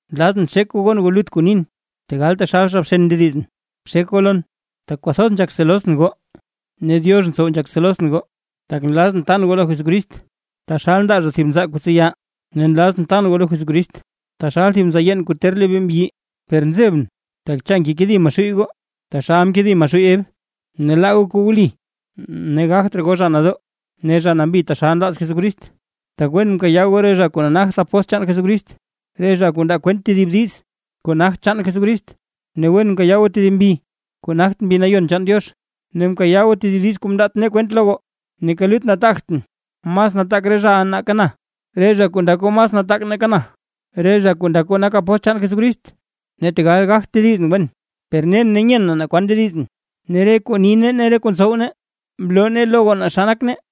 ¡Nlazʼn xek goo gon goo lut kuu nin, tegal taxal zha bxen ndedizʼn! Bxek goo lon. Tak kwathoz nzhak selosʼn goo, ne Diox ntsow nzhak selosʼn goo. Tak nlazʼn tan goo lo Jesucrist taxal ndaa zha thib nzaa kuu tseya, ne nlazʼn tan goo lo Jesucrist taxal thib nzaa yeen kuu ter lebee mbyi. Per nzebʼn, tak cha ngekedi Maxuuy goo taxal mkedi Maxuuy Ev, ne laa goo kuu wli ne gagt raa goo zha nadoo ne zha nambi taxal nlaaz Jesucrist. Tak wen nkayaa goo re zha kuu nagt apóstl chaan Jesucrist, re zha kuu ndaa kwent tedib diiz kuu nagt chaan Jesucrist. Ne wen nkayaa goo tedib mbi kuu nagt Mbi Nayon chaan Diox, ne nkayaa goo tedib diiz kuu mndaat nee kwent lo goo. Neeka lut ndagtʼn mas nataak re zhaʼa nake na, re zha kuu ndak goo mas nataak nake na, re zha kuu ndak goo nak apóstl chaan Jesucrist. Ne tegal gagtʼn tedizʼn wen, per nen ne nyen naa kwan ndedizʼn, ne re kuu ni nee ne re kuu ntsow nee, mloo nee lo goo naa xa nak nee.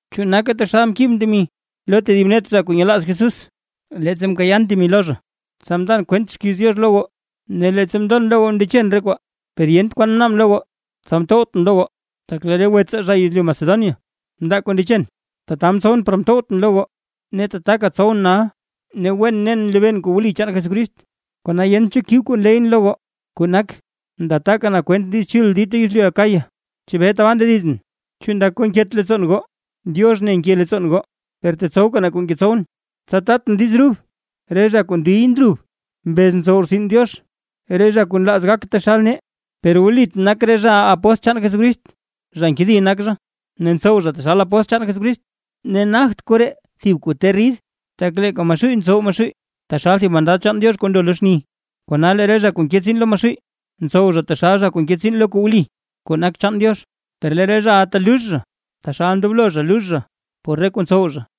Chu nake taxal mkibʼn temi tedib net re zha kuu nyelaaz Jesús, leettsa mkayaan temi lo zha, tsa mndan kwent xkiiz Diox lo goo. Ne leettsa mndon lo goo ne mndechen re kwaa, per yent kwan mnaabʼn lo goo, tsa mtowtʼn lo goo. Tak lee re wetsaa zha yezlyu Macedonia mndaa kuu mndechen. Tata mtsowʼn par mtowtʼn lo goo, ne tataka tsowʼn nal. Ne wen nen nlebeen kuu wli chaan Jesucrist, kona yent cho kib kuu nleyʼn lo goo, kuu nak, nda taka na kwent Diiz Chul dita yezlyu Acaya. ¿Chebee tabaa ndedizʼn? ¿Chu ndak goo nket leettsoon goo? ¡Diox ne nke leettsoon goo! Per tetsowka na kuu ngetsowʼn, tsa tatʼn diiz rub re zha kuu ndiy ndrub mbez ntsow rtsin Diox, re zha kuu nlaaz gak taxal nee. Per wlit nak re zhaʼa apóstl chaan Jesucrist, zha nkedi nak zha, ne ntsow zha taxal apóstl chaan Jesucrist. Ne nagt koree thib kuu ter rid, tak leeka Maxuuy mtsow Maxuuy taxal thib mandad chaan Diox kuu ndo lo xni, kona lee re zha kuu nke tsiin lo Maxuuy, ntsow zha taxal zha kuu nke tsiin lo kuu wli kuu nak chaan Diox. ¡Per lee re zhaʼa telux zha, taxal ndoblo zha lux zha, por re kuu ntsow zha!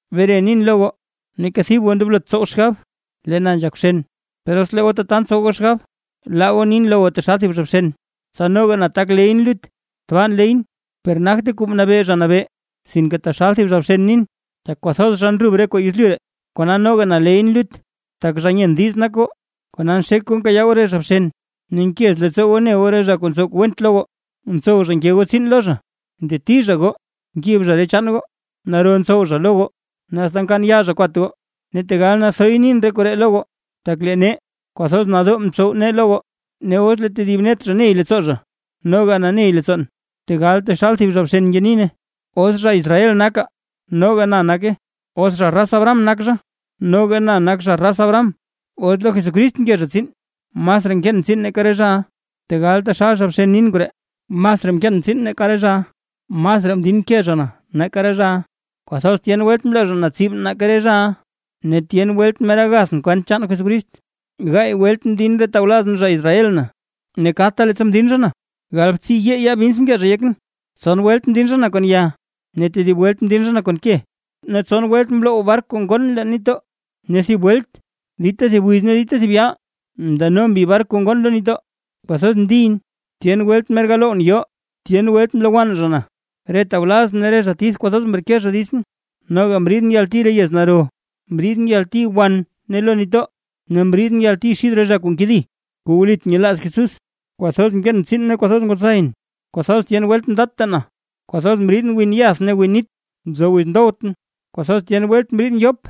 Bere nin lo goo, neeka thib goo ndoblot tsow xgab, lee na nzhak bxen na, per os lee goo tata ntsow goo xgab, laa goo nin lo goo taxal thib zha bxen, tsa noga na tak leyʼn lut. Tbaa nleyʼn, per nagte kuu mnabee Zha Nabee, sinke taxal thib zha bxen nin. ¡Tak kwathoz zha ndrub zha re kuu yezlyu ree, kona noga na leyʼn lut! Tak zha nyen diiz nak goo, kona nxek goo nkayaa goo re zha bxen, ne nkez leettsoo goo ne goo re zha kuu ntsow kuu went lo goo; ntsow zha nke goo tsiin lo zha, nteti zha goo, nkib zha re chaan goo, naro ntsow zha lo goo ne asta nkaan yaa zha kwat goo. Ne tegal nathoy nin koree lo goo, tak lee nee, kwathoz nadoo mtsow nee lo goo. Ne os lee tedib net zha ney leettsoo zha, noga na ney leettsoon, tegal taxal thib zha bxen ngenin. ¿Os zha Israel nak zha? Noga na nake. ¿Os raz Abraham nak zha? Noga na nak zha raz Abraham. ¿Os lo Jesucrist nke zha tsiin? Masraa nkeen tsiin nake re zhaʼa, tegal taxal zha bxen nin koree, masraa mkeen tsiin nake re zhaʼa. Masraa mdinke zha na nake re zhaʼa, kwathoz tyen welt mloo zha na tsib nake re zhaʼa, ne tyen welt mer agathʼn kwent chaan Jesucrist. Gaay welt mdin re tawlazʼn zha Israel na, ne kadta leettsa mdin zha na, galbtsiiyee yaa bins mkee zha yekʼn. Tson welt mdin zha na kon ya, ne tedib welt mdin zha na kon ke. Ne tson welt mloww bark kuu ngoon leen nitdoo, ne thib welt dita thib wiz ne dita thib yaal ndano mbi bark kuu ngoon lo nitdoo. Kwathoz mndiyʼn, tyen welt mer galowwʼn yoo, tyen welt mlowann zha na, re tawlazʼn ne re zha tith kwathoz mreke zha ditsʼn. Noga mriidʼn yalti re yez naro, mriidʼn yalti wan ne lo nitdoo, ne mriidʼn yalti xid re zha kuu nkedi kuu wlit nyelaaz Jesús. Kwathoz mkeen tsiin ne kwathoz ngwatsayʼn; kwathoz tyen welt mdatta na, kwathoz mriidʼn win yath ne win nit, nzo wiz ndowtʼn; kwathoz tyen welt mriidʼn yop,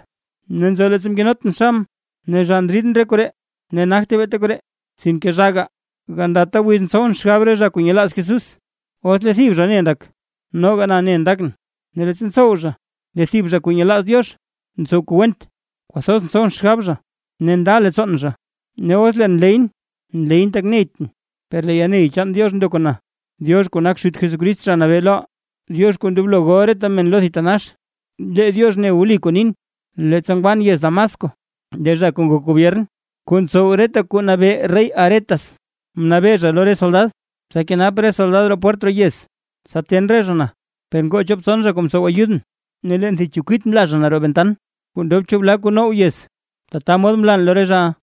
ne nzo leettsa mkenotʼn xabʼn. Ne zhaa ndriidʼn re koree ne nagte beeta koree, sinke zhaaga, gandata wiz ntsowʼn xgab re zha kuu nyelaaz Jesús. Os lee thib zha ne ndak noga na ne ndakʼn, ne leettsa ntsow zha lee thib zha kuu nyelaaz Diox ntsow kuu went, kwathoz ntsowʼn xgab zha ne nda leettsoon zha. Ne os leen nleyʼn, nleyʼn tak neytʼn, per lee yalney chaan Diox ndo kon na. Diox kuu nak Xut Jesucrist, Zha Nabee loʼaa, Diox kuu ndoblo gol reta men lo thitanax, lee Diox ne wli kuu nin. Leettsa ngwan yez Damasco, lee zha kuu ngok gobyern, kuu ntsow reta kuu nabee rey Aretas, mnabee zha lo re soldad, tsa kenap re soldad roo pwert roo yez, tsa ten re zha na, per ngoo chop tson zha kuu mtsow ayudʼn, ne leen thib chekwit mla zha na roo ventan kuu ndob chu bla kuu now yez, tata mod mlan lo re zhaʼa.